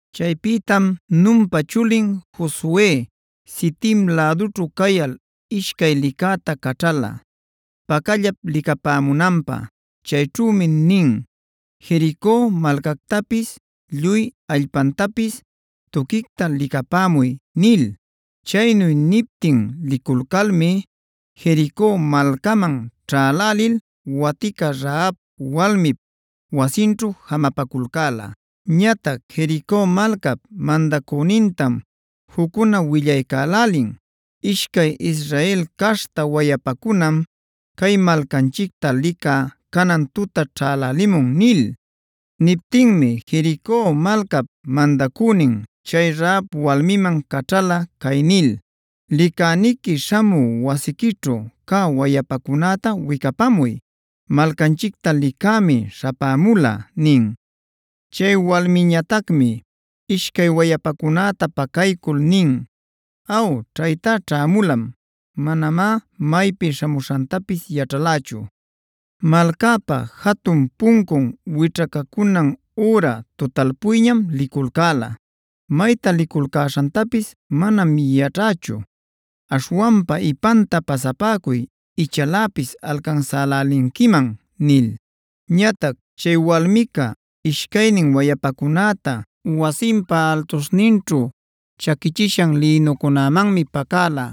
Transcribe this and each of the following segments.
Chaypïtam Nunpa chulin Josue Sitim lädućhu cayal ishcay licäta caćhala pacallap licapämunanpä. Chayćhümi nin: “Jerico malcactapis lluy allpantapis tuquicta licapämuy” nil. Chaynu niptin liculcalmi Jerico malcaman ćhälälil watica Rahaba walmip wasinćhu jamapaculcäla. Ñatac Jerico malcap mandacünintam juccuna willaycälälin: “Ishcay Israel caśhta wayapacunam cay malcanchicta licä canan tuta ćhälälimun” nil. Niptinmi Jerico malcap mandacünin chay Rahab walmiman caćhala cay nil: “Licäniqui śhamü wasiquićhu cä wayapacunäta wicapämuy; malcanchicta licämi śhapämula” nin. Chay walmiñatacmi ishcay wayapacunäta pacaycul nin: “Aw, ćhaytá ćhämulam. Manamá maypi śhamuśhantapis yaćhalächu. Malcäpa jatun puncun wićhacunan üra tutalpuyñam liculcäla. Mayta liculcäśhantapis manam yaćhächu. Aśhwanpa ipanta pasapäcuy ichaläpis alcansälälinquiman” nil. Ñatac chay walmica ishcaynin wayapacunäta wasinpa altuśhninćhu chaquichishan lïnucunämanmi pacäla.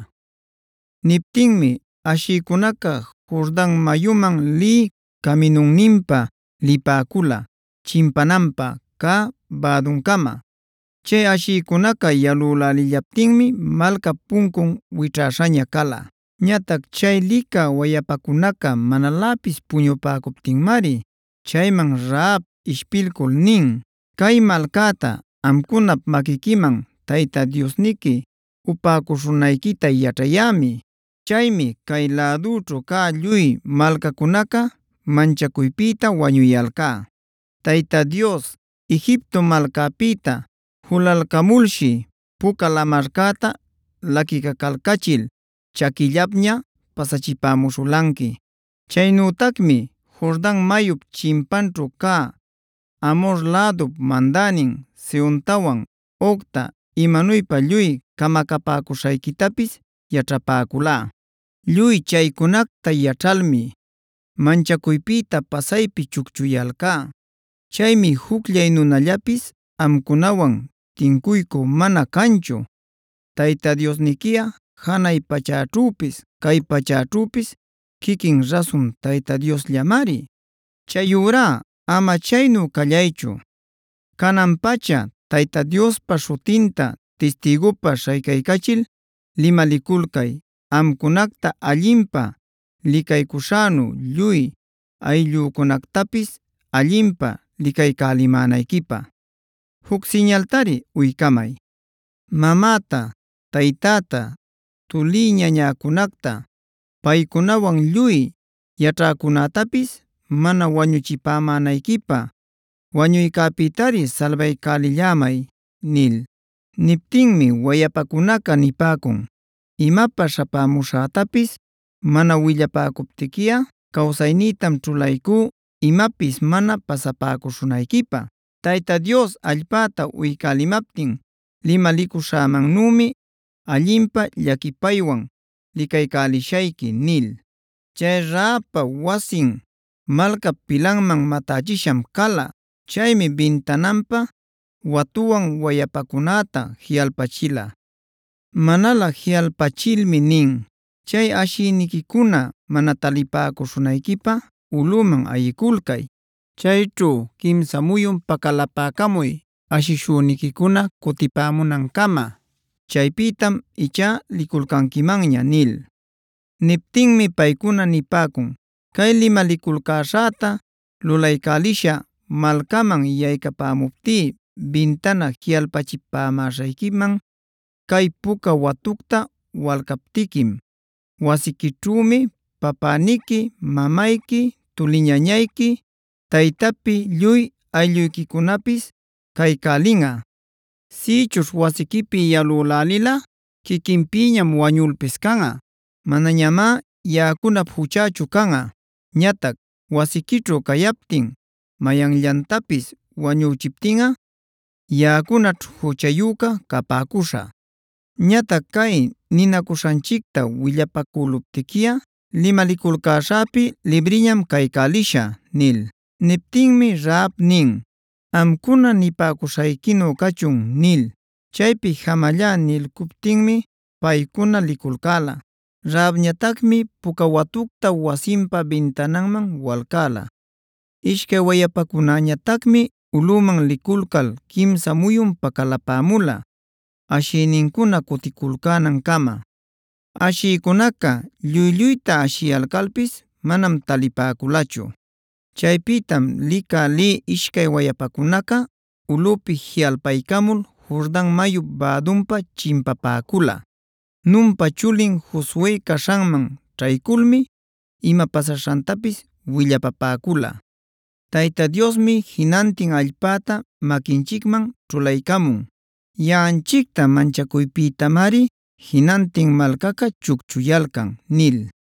Niptinmi ashïcunaca Jordan mayuman lï caminunninpa lipäcula chimpanapä cä bäduncama. Chay ashïcunaca yalülälillaptinmi malcap puncun wićhäśhäña cala. Ñatac chay licä wayapacunaca manaläpis puñupäcuptinmari chayman Rahab ishpilcul nin: “Cay malcäta amcunap maquiquiman Tayta Diosniqui upäcuśhunayquita yaćhayämi. Chaymi cay lädućhu cä lluy malcacunaca manchacuypïta wañuyalcá. Tayta Dios Egipto malcäpïta julalcamulshi Puca Lamarcäta laquicacalcachil chaquillapña pasachipämuśhulanqui.b Chaynütacmi Jordan mayup chimpanćhu cä Amhor lädup mandänin Sehontawan, Ogtac imanuypä lluy camacapäcuśhayquitapis yaćhapäculá. Lluy chaycunacta yaćhalmi manchacuypïta pasaypi chucchuyalcá. Chaymi jucllay nunallapis amcunawan tincuycü mana canchu. Tayta Diosniquiꞌa janay pachäćhüpis cay pachäćhüpis quiquin rasun Tayta Diosllamari. Chayurá ama chaynu callaychu, canan-pacha Tayta Diospa śhutinta tistïgupä śhaycaycachil limaliculcay amcunacta allinpä licaycuśhänu lluy ayllücunactapis allinpä licaycälimänayquipä. Juc siñaltari uycamay, mamäta, taytäta, tulï-ñañäcunacta, paycunawan lluy yaćhäcunätapis mana wañuchipämänayquipä. Wañuycäpïtari salbaycälillämay” nil. Niptinmi wayapacunaca nipäcun: “Imapä śhapämuśhätapis mana willapacuptiquiꞌa cawsaynïtam ćhulaycú imapis mana pasapäcuśhunayquipä. Tayta Dios allpäta uycälimaptin limalicuśhämannümi allinpä llaquipaywan licaycälishayqui” nil. Chay Rahabpa wasin, malcap pilanman matächisham cala. Chaymi bintananpä watuwan wayapacunäta jiꞌalpachila. Manalä jiꞌalpachilmi nin: “Chay ashishüniquicuna mana talipäcuśhunayquipä ulꞌüman ayiculcay. Chayćhu quimsa muyun pacalapäcamuy ashishüniquicuna cutipämunancama. Chaypïtam ichá liculcanquimanña” nil. Niptinmi paycuna nipäcun: “Cay limaliculcäśhäta lulaycälishä, malcaman yaycapäcamuptí bintana jiꞌalpachipämäśhayquiman cay puca watucta walcaptiquim. Wasiquićhümi papäniqui, mamayqui, tuli-ñañayqui, taytapi lluy aylluyquicunapis caycälinꞌa. Sïchuśh wasiquipi yalülälilꞌa quiquinpïñam wañulpis canꞌa. Manañamá yaꞌacunap juchächu canꞌa. Ñatac wasiquićhu cayaptin mayanllantapis wañüchiptinꞌa yaꞌacunaćh juchayüca capäcuśhä. Ñatac cay ninacuśhanchicta willapacüluptiquiꞌa limaliculcäśhäpi libriñam caycälishä” nil. Niptinmi Rahab nin: “Amcuna nipäcuśhayquinu cachun” nil. Chaypi jamallá nilcuptinmi paycuna liculcäla. Rahabñatacmi puca watucta wasinpa bintananman walcäla. Ishcay wayapacunäñatacmi ulꞌüman liculcal quimsa muyun pacalapämula ashïnincuna cuticulcänancama. Ashïcunaca lluy-lluyta ashiyalcalpis manam talipäculachu. Chaypïtam licä lï ishcay wayapacunaca ulꞌüpi jiꞌalpaycamul Jordan mayup bädunpa chimpapäcula. Nunpa chulin Josue caśhanman ćhayculmi ima pasaśhantapis willapapäcula: “Tayta Diosmi jinantin allpäta maquinchicman ćhulaycamun. Yaꞌanchicta manchacuypïtamari jinantin malcaca chucchuyalcan” nil.